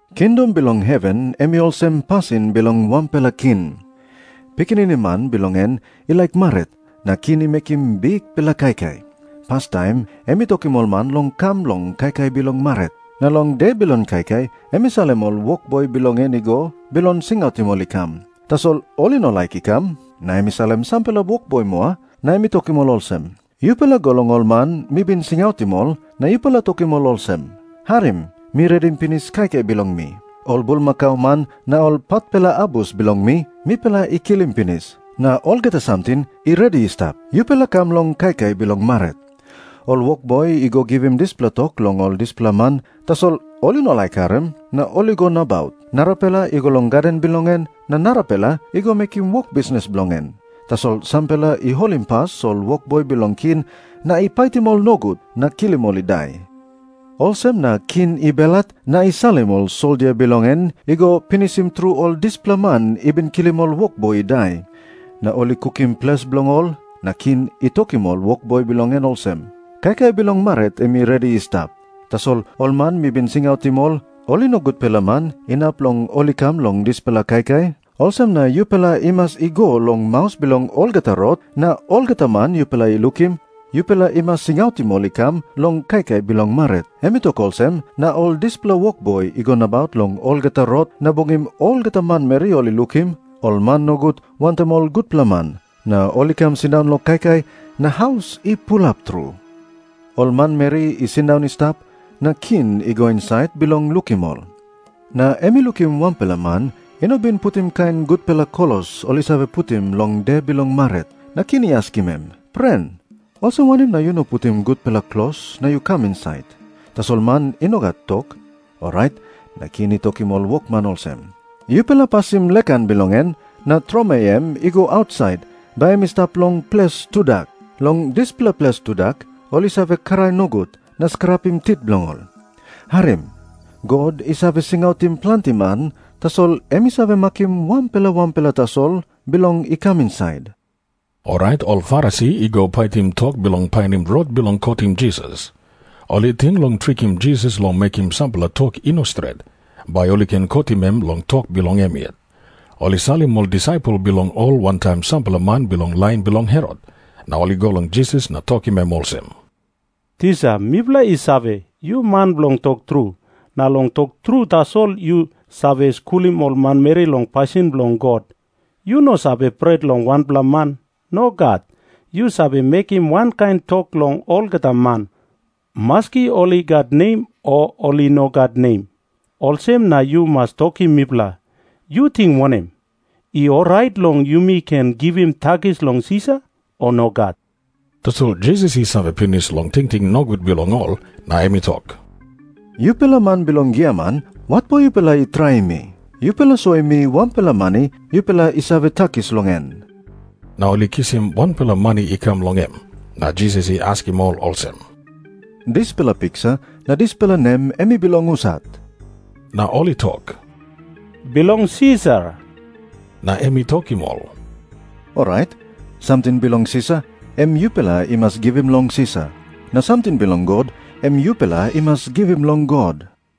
“Kingdom bilong heven em i olsem pasin bilong wanpela king. Pikinini man bilong en i laik marit, na king i mekim bikpela kaikai. Pastaim em i tokim ol man long kam long kaikai bilong marit. Na long de bilong kaikai em i salim ol wokboi bilong en i go bilong singautim ol i kam. Tasol ol i no laik i kam. Na em i salim sampela wokboi moa, na em i tokim ol olsem, ‘Yupela go long ol man mi bin singautim ol, na yupela tokim ol olsem, “Harim. Mi redim pinis kaikai bilong mi. Ol bulmakau man na ol patpela abus bilong mi, mipela i kilim pinis. Na olgeta samting i redi i stap. Yupela kam long kaikai bilong marit.” ’ “Ol wokboi i go givim dispela tok long ol dispela man, tasol ol i no laik harim, na ol i go nabaut. Narapela i go long gaden bilong en, na narapela i go mekim wok bisnis bilong en. Tasol sampela i holimpas ol wokboi bilong king na i paitim ol nogut, na kilim ol i dai. Olsem na king i belhat na i salim ol soldia bilong en i go pinisim tru ol dispela man i bin kilim ol wokboi i dai. Na ol i kukim ples bilong ol. “Na king i tokim ol wokboi bilong en olsem, ‘Kaikai bilong marit em i redi i stap, tasol ol man mi bin singautim ol, ol i no gutpela man inap long ol i kam long dispela kaikai. Olsem na yupela i mas i go long maus bilong olgeta rot, na olgeta man yupela i lukim, yupela i mas singautim ol i kam long kaikai bilong marit.’ Em i tok olsem, na ol dispela wokboi i go nabaut long olgeta rot na bungim olgeta manmeri ol i lukim, ol man nogut wantaim ol gutpela man. Na ol i kam sindaun long kaikai na haus i pulap tru. “Ol manmeri i sindaun i stap, na king i go insait bilong lukim ol. Na em i lukim wanpela man i no bin putim kain gutpela klos ol i save putim long de bilong marit. Na king i askim em, ‘Pren, olsem wanem na yu no putim gutpela klos na yu kam insait?’ Tasol man i no gat tok. Orait na king i tokim ol wokman olsem, ‘Yupela pasim lek han bilong en na tromoi em i go ausait bai em i stap long ples tudak. Long dispela ples tudak ol i save krai nogut na skrapim tit bilong ol.’ “Harim. God i save singautim planti man, tasol em i save makim wanpela wanpela tasol bilong i kam insait.” Orait ol Farisi i go paitim tok bilong painim rot bilong kotim Jisas. Ol i ting long trikim Jisas long mekim sampela tok i no stret, bai ol i ken kotim em long tok bilong em yet. Ol i salim ol disaipel bilong ol wantaim sampela man bilong lain bilong Herot, na ol i go long Jisas na tokim em olsem, “Tisa, mipela i save, yu man bilong tok tru. Na long tok tru tasol yu save skulim ol manmeri long pasin bilong God. Yu no save pret long wanpela man. Nogat. Yu save mekim wankain tok long olgeta man, maski ol i gat nem o ol i no gat nem. Olsem na yu mas tokim mipela. Yu ting wanem? I orait long yumi ken givim takis long Sisar, o nogat?” Tasol Jisas i save pinis long tingting nogut bilong ol, na em i tok, “Yupela man bilong giaman, watpo yupela i traim mi? Yupela soim mi wanpela mani yupela i save takis long en.” Na ol i kisim wanpela mani i kam long em. Na Jisas i askim ol olsem, “Dispela piksa na dispela nem em i bilong husat?” Na ol i tok, “Bilong Sisar.” Na em i tokim ol, “Orait, samting bilong Sisar, em yupela i mas givim long Sisar. Na samting bilong God, em yupela i mas givim long God.”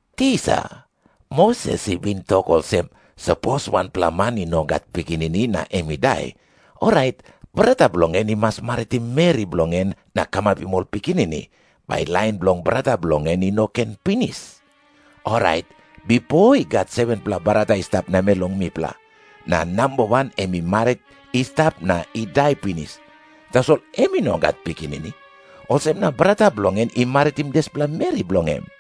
“Tisa, Moses i bin tok olsem, ‘Sapos wanpela man i no gat pikinini na em i dai, orait brata bilong en i mas maritim meri bilong en na kamapim ol pikinini, bai lain bilong brata bilong en i no ken pinis.’ Orait bipo i gat 7-pela brata i stap namel long mipela. Na namba wan em i marit i stap na i dai pinis, tasol em i no gat pikinini. Olsem na brata bilong en i maritim dispela meri bilong em.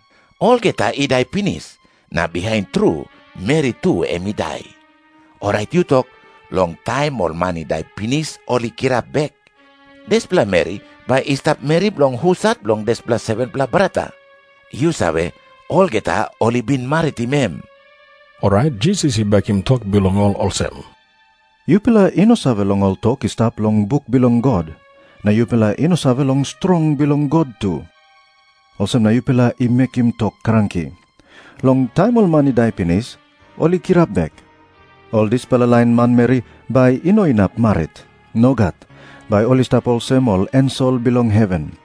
Olgeta i dai pinis, na bihain tru meri tu em i dai. Orait yu tok. Long taim ol man i dai pinis ol i kirap bek, dispela meri bai i stap meri bilong husat bilong dispela 7-pela brata? Yu save, olgeta ol i bin maritim em.” Orait Jisas i bekim tok bilong ol olsem, “Yupela i no save long ol tok i stap long buk bilong God. Na yupela i no save long strong bilong God tu. Olsem na yupela i mekim tok kranki. Long taim ol man i dai pinis ol i kirap bek, ol dispela lain manmeri bai i no inap marit. Nogat. Bai ol i stap olsem ol ensel bilong heven.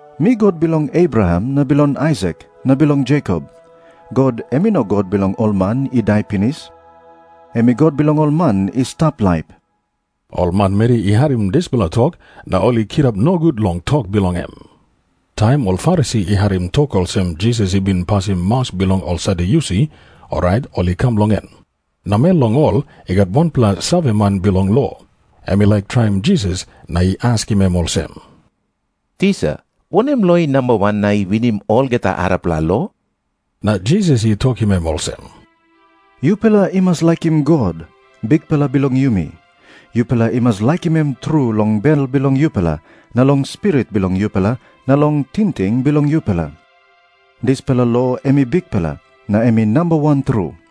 ‘Mi God bilong Abraham na bilong Aisak na bilong Jekop.’ God em i no God bilong ol man i dai pinis. Em i God bilong ol man i stap laip.” Ol manmeri i harim dispela tok, na ol i kirap nogut long tok bilong em. Taim ol Farisi i harim tok olsem Jisas i bin pasim maus bilong ol Sadyusi, orait ol i kam long em. Namel long ol i gat wanpela saveman bilong lo. Em i laik traim Jisas na i askim em olsem, “Tisa, wanem lo i namba wan na i winim olgeta arapela lo?” Na Jisas i tokim em olsem, “ ‘Yupela i mas laikim God, Bikpela bilong yumi. Yupela i mas laikim em tru long bel bilong yupela na long spirit bilong yupela na long tingting bilong yupela.’ Dispela lo em i bikpela, na em i namba wan tru.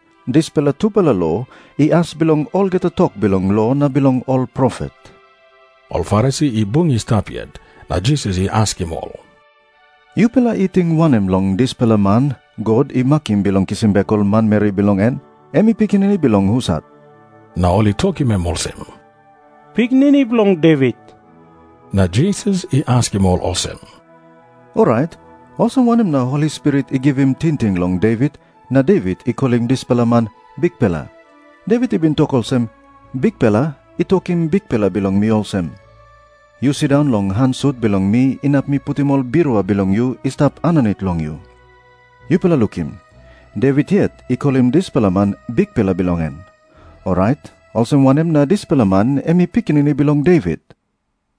Dispela tupela lo i as bilong olgeta tok bilong lo na bilong ol profet.” Ol Farisi i bung i stap yet, na Jisas i askim ol, “Yupela i ting wanem long dispela man God i makim bilong kisim bek ol manmeri bilong en? Em i pikinini bilong husat?” Na ol i tokim em olsem, “Pikinini bilong Devit.” Na Jisas i askim ol olsem, “Orait olsem wanem na Holi Spirit i givim tingting long Devit na Devit i kolim dispela man ‘Bikpela’? Devit i bin tok olsem, ‘Bikpela i tokim Bikpela bilong mi olsem, “Yu sindaun long han sut bilong mi inap mi putim ol birua bilong yu i stap aninit long yu.” ’ Yupela lukim. Devit yet i kolim dispela man Bikpela bilong en. Orait olsem wanem na dispela man em i pikinini bilong Devit?”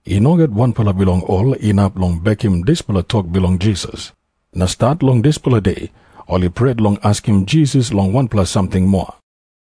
I no gat wanpela bilong ol inap long bekim dispela tok bilong Jisas. Na stat long dispela de, ol i pret long askim Jisas long wanpela samting moa.